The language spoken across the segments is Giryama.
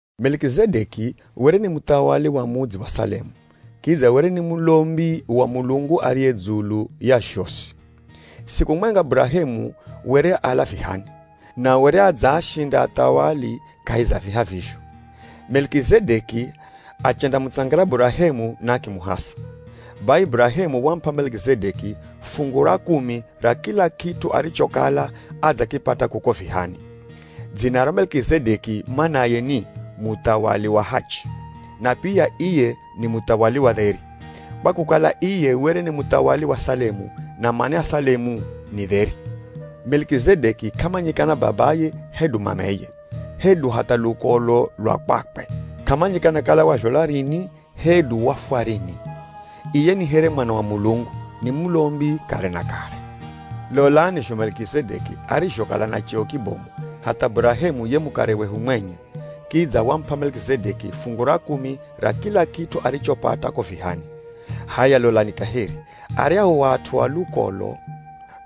Melikizedeki were ni muthawali wa mudzi wa Salemu, kidza were ni mulombi wa Mulungu ariye dzulu ya zhosi. Siku mwenga Burahemu were ala vihani, na were adzaashinda athawali kahi za viha vizho. Melikizedeki achendamutsangira Burahemu na akimuhasa. Bai Burahemu wamup'a Melikizedeki fungu ra kumi ra kila kit'u arichokala adzakipata kuko vihani. Dzina ra Melikizedeki manaye ni “Muthawali wa hachi” na pia iye ni “Muthawali wa dheri” kwa kukala iye were ni muthawali wa Salemu, na mana ya Salemu ni “dheri.” Melikizedeki k'amanyikana babaye hedu mameye, hedu hatha lukolo lwa kwakwe. K'amanyikana kala wazhalwa rini, hedu wafwa rini. Iye ni here Mwana wa Mulungu, ni mulombi kare na kare. Lolani zho Melikizedeki arizhokala na cheo kibomu, hatha Burahemu ye mukare wehu mwenye, kidza wamup'a Melikizedeki fungu ra kumi ra kila kit'u arichopata ko vihani. H'aya lolani kaheri, aryahu at'u a lukolo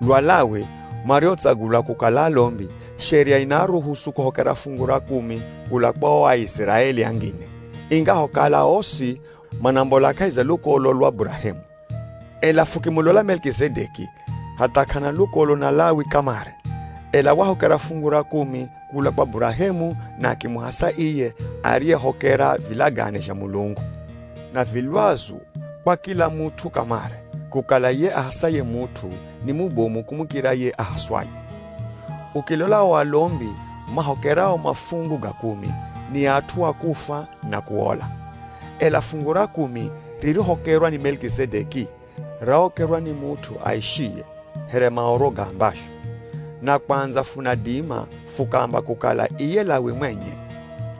lwa Lawi mariotsagulwa kukala alombi, sheria inaaruhusu kuhokera fungu ra kumi kula kwa o Aiziraeli angine, ingahokala osi manambola kahi za lukolo lwa Burahemu. Ela fukimulola Melikizedeki, hatha k'ana lukolo na Lawi kamare, ela wahokera fungu ra kumi kula kwa Burahemu na akimuhasa iye ariyehokera vilagane zha Mulungu. Na vi lwazu kwa kila mut'u kamare, kukala ye ahasaye mut'u ni mubomu kumukira ye ahaswaye. Ukilola o alombi mahokerao mafungu ga kumi, ni at'u a kufwa na kuola. Ela fungu ra kumi rirohokerwa ni Melikizedeki, rahokerwa ni mut'u aishiye, here Maoro gaambazho. Na kwandza funadima fukaamba kukala iye Lawi mwenye,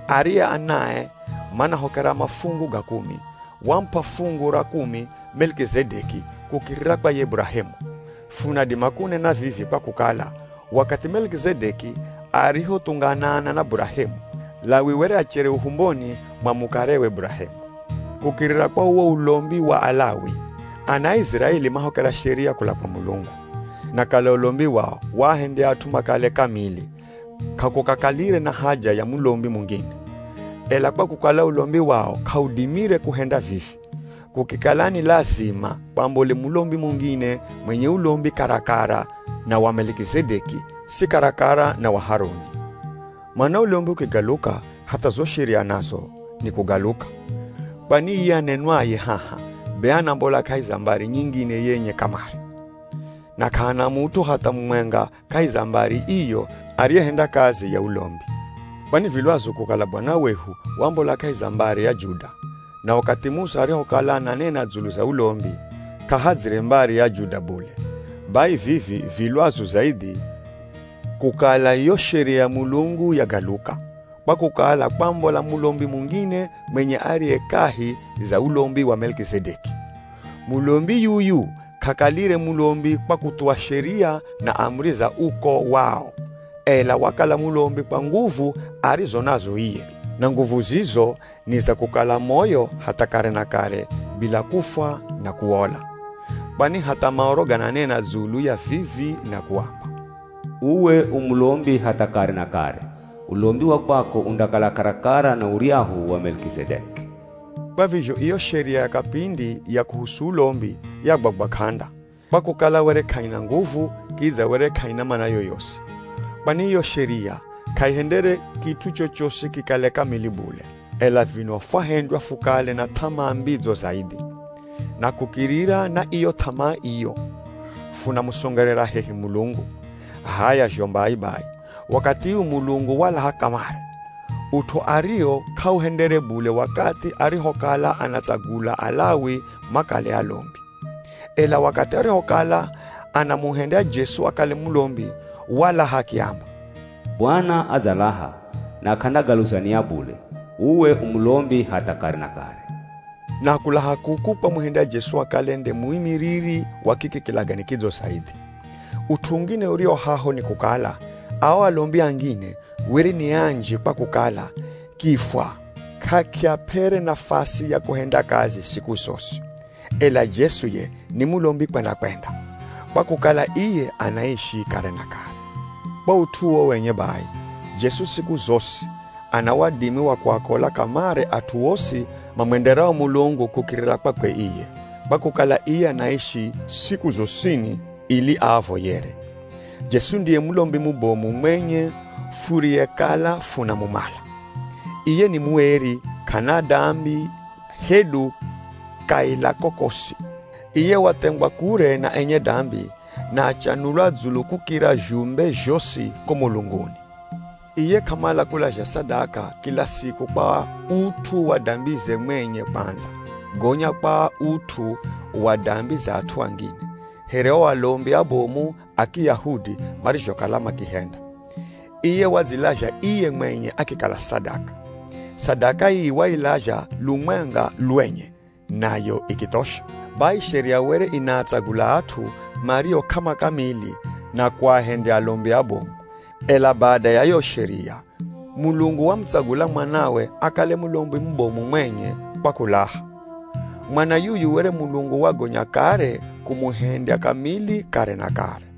ariye anae manahokera mafungu ga kumi, wamup'a fungu ra kumi Melikizedeki kukirira kwa ye Burahemu. Funadima kunena vivi kwa kukala, wakathi Melikizedeki arihothunganana na Burahemu, Lawi were achere uhumboni mwa mukarewe Burahemu. Kukirira kwa uwo ulombi wa Alawi, ana a Iziraeli mahokera sheria kula kwa Mulungu. Na kala ulombi wao waahendya at'u makale kamili, k'akukakalire na haja ya mulombi mungine. Ela kwa kukala ulombi wao k'audimire kuhenda vivi, kukikala ni lazima kwambole mulombi mungine mwenye ulombi karakara na wa Melikizedeki si karakara na wa Haruni. Mana ulombi ukigaluka, hatha zo sheria nazo nikugaluka. Kwani iye anenwaye haha be anambola kahi za mbari nyingine yenye kamare. Na k'ahana mut'u hatha mumwenga kahi za mbari iyo ariyehenda kazi ya ulombi. Kwani vi lwazu kukala Bwana wehu wambola kahi za mbari ya Juda, na wakathi Musa arihokala ananena dzulu za ulombi, k'ahadzire mbari ya Juda bule. Bai vivi vi lwazu zaidhi kukala yo sheria ya Mulungu yagaluka, kwa kukala kwambola mulombi mungine mwenye ariye kahi za ulombi wa Melikizedeki. Mulombi yuyu k'akalire mulombi kwa kuthuwa sheria na amuri za uko wao, ela wakala mulombi kwa nguvu arizo nazo iye. Na nguvu zizo ni za kukala moyo hatha kare na kare bila kufwa na kuola. Kwani hatha Maoro gananena dzulu ya vivi na kuamba, “Uwe u mulombi hatha kare na kare, ulombi wa kwako undakala karakara na uryahu wa Melikizedeki.” Kwa vizho iyo sheria ya kapindi ya kuhusu ulombi, yagwagwa k'anda, kwa kukala were k'aina nguvu, kidza were k'aina mana yoyosi. Kwani iyo sheria k'aihendere kit'u chochosi kikale kamili bule, ela vino fwahendywa fukale na th'amaa mbidzo zaidhi. Na kukirira na iyo th'amaa iyo, funamusongerera hehi Mulungu. H'aya zho mbai bai, wakathi uu Mulungu walaha kamare, ut'u ariwo k'auhendere bule wakathi arihokala anaatsagula Alawi makale alombi. Ela wakathi arihokala anamuhendya Jesu akale mulombi walaha akiamba, “Bwana adzalaha, na k'andagaluza nia bule, ‘Uwe u mulombi hatha kare na kare.’” Na kulaha kuku kwamuhendya Jesu akale nde muimiriri wa kiki kilagane kidzo zaidhi. Ut'u ungine uriwo haho ni kukala, ao alombi angine were ni anji kwa kukala kifwa k'akiap'ere nafasi ya kuhenda kazi siku zosi. Ela Jesu ye ni mulombi kwenda-kwenda, kwa kukala iye anaishi kare na kare. Kwa ut'u uwo wenye bai, Jesu, siku zosi ana wadimi wa kuaokola kamare at'u osi mamwenderao Mulungu kukirira kwakwe iye, kwa kukala iye anaishi siku zosini ili aavoyere. Jesu ndiye mulombi mubomu mwenye furiyekala funamumala. Iye ni mueri, k'ana dambi hedu kaila kokosi. Iye wathengwa kure na enye dambi na achanulwa dzulu kukira zhumbe zhosi ko mulunguni. Iye k'amala kulazha sadaka kila siku kwa ut'u wa dambize mwenye kwandza, gonya kwa ut'u wa dambi za at'u angine, here o alombi abomu a Kiyahudi marizhokala makihenda. Iye wadzilazha iye mwenye akikala sadaka. Sadaka ii wailazha lumwenga lwenye nayo ikithosha. Bai sheria were inaatsagula at'u mario k'amakamili na kuahendya alombi abomu. Ela bada ya yo sheria, Mulungu wamutsagula Mwanawe akale mulombi mubomu mwenye kwa kulaha. Mwana yuyu were Mulungu wagonya kare kumuhendya kamili kare na kare.